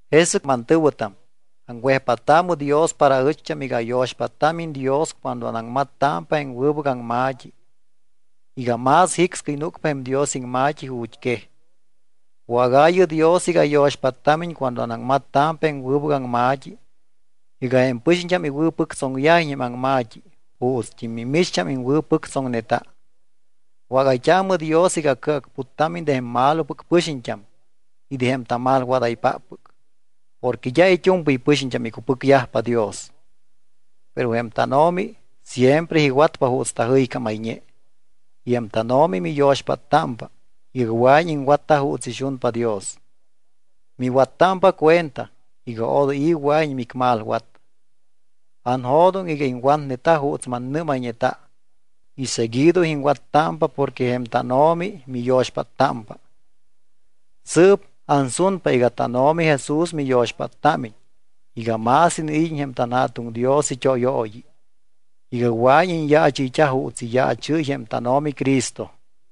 Jesɨc, mantɨ̱wɨtam, aŋwejpáttaamɨ Dios para aɨcht́am iga ayo̱xpáttámiñ Dios cuando anaŋmattámpa jém wɨbɨc aŋma̱t́i iga más jicscɨy núcpa jém Dios iŋma̱t́i ju̱t́quej. Wágaayɨ Dios iga ayo̱xpáttámiñ cuando anaŋmattámpa jém wɨbɨc aŋma̱t́i iga jém pɨxiñt́am iwɨ̱pɨctsoŋyajiñ jém aŋma̱t́i juutst́im mimicht́am iŋwɨ̱pɨctsoŋneta. Wágayt́aamɨ Dios iga acɨacputtámiñ de jém malopɨc pɨxiñt́am y de jém tamalwadaypáppɨc. Porque d́a it́u̱mpɨy pɨxiñt́am icupɨcyajpa Dios. Pero jém tánO̱mi siempre iwatpa juuts tajɨycámayñe. Y jém tánO̱mi miyo̱xpáttámpa iga wɨa̱iñ iŋwatta juuts ixunpa Dios. Miwattámpa cuenta iga odoy i̱ wɨa̱iñ micmalwat. Anjo̱doŋ iga iŋwatneta juuts mannɨ́mayñeta y seguido iŋwattámpa porque jém tánO̱mi miyo̱xpáttámpa. Sɨɨp ansunpa iga tánO̱mi Jesús miyo̱xpáttámiñ iga más iniid́iñ jém tanJa̱tuŋ Dios it́óyooyi, iga wɨa̱iñ iñyaachɨyt́a juuts iyaachɨ́y jém tánO̱mi Cristo.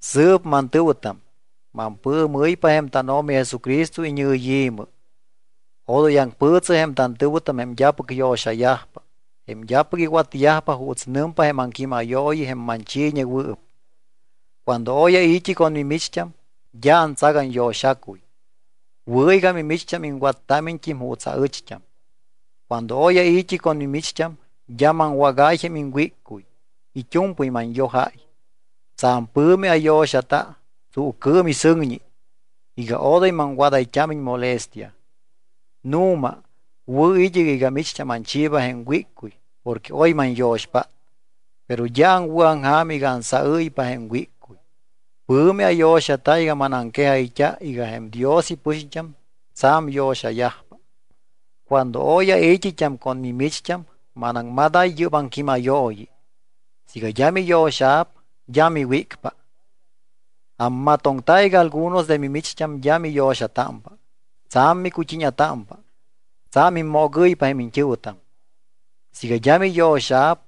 Sɨɨp, mantɨ̱wɨtam, mampɨɨmɨ́ypa jém tánO̱mi Jesucristo iñɨyi̱mɨ, odoy aŋpɨɨtsɨ jém tantɨ̱wɨtam jém d́apɨc yo̱xayajpa, jém d́apɨc iwatyajpa juuts nɨmpa jém aŋquímayooyi jém manchiiñewɨɨp. Cuando oy ai̱t́i con mimicht́am, d́a antsac anyo̱xacuy. Wɨ̱ iga mimicht́am iŋwattámiñt́im juuts aɨcht́am. Cuando oy ai̱t́i con mimicht́am, d́a maŋwágáy jém iŋwíccuy, it́u̱mpɨy manyojáy. Tsa̱m pɨ̱mi ayo̱xata tsuucɨɨm y sɨŋñi iga odoy maŋwadayt́ámiñ molestia. Nu̱ma, wɨ̱ id́ɨc iga micht́am anchiiba jém wíccuy porque oy manyo̱xpát, pero d́a aŋwɨ̱aŋja̱m iga ansaɨ́ypa jém wíccuy. Pɨ̱mi ayo̱xata iga manaŋquejayt́a iga jém Dios ipɨxiñt́am tsa̱m yo̱xayajpa. Cuando oy ai̱t́it́am con mimicht́am, manaŋmadáy yɨ́p aŋquímayooyi: Siiga d́a miyo̱xa̱p d́a miwícpa. Ammatoŋta iga algunos de mimicht́am d́a miyo̱xatámpa. Tsa̱m micut́íña̱támpa. Tsa̱m immoogɨ́ypa jém iñt́ɨ̱wɨtam. Siiga d́a miyo̱xa̱p,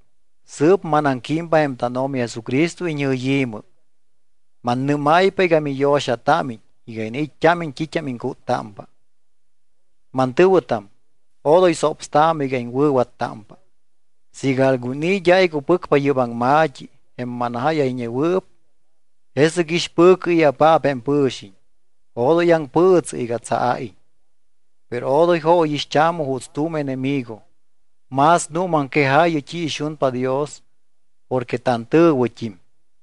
sɨɨp manaŋquímpa jém tánO̱mi Jesucristo iñɨyi̱mɨ, mannɨ́máypa iga miyo̱xatámiñ iga iniit́t́ámiñ t́it́am iŋcúttámpa. Mantɨ̱wɨtam, odoy sopstaamɨ iga iŋwɨ̱wattámpa. Siiga algun i̱ d́a icupɨcpa yɨ́p aŋma̱t́i, jém manjáyayñewɨɨp, jesɨc ixpɨ̱cɨ i̱apaap jém pɨ̱xiñ, odoy aŋpɨɨtsɨ iga tsaaiñ. Pero odoy jóyixt́aamɨ juuts tu̱m enemigo, más nuumaŋquejaayɨ t́i ixunpa Dios porque tantɨ̱wɨt́im.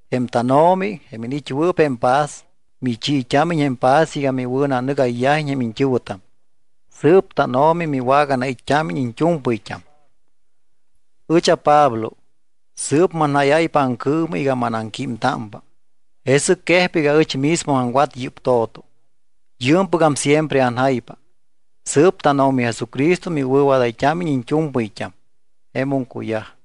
Jém tánO̱mi, jém iniit́wɨɨp jém paz, michiit́ámiñ jém paz iga miwɨ̱nanɨgayyajiñ jém iñt́ɨ̱wɨtam. Sɨɨp tánO̱mi miwaganait́t́ámiñ iñt́u̱mpɨyt́am. Ɨch aPablo. Sɨɨp manjáyáypa aŋcɨɨmɨ iga manaŋquímtámpa. Jesɨc quejpa iga ɨch mismo aŋwat yɨ́p to̱to. Yɨɨmpɨgam siempre anjaypa. Sɨɨp tánO̱mi Jesucristo miwɨ̱wadayt́ámiñ iñt́u̱mpɨyt́am. Jemum cuyaj.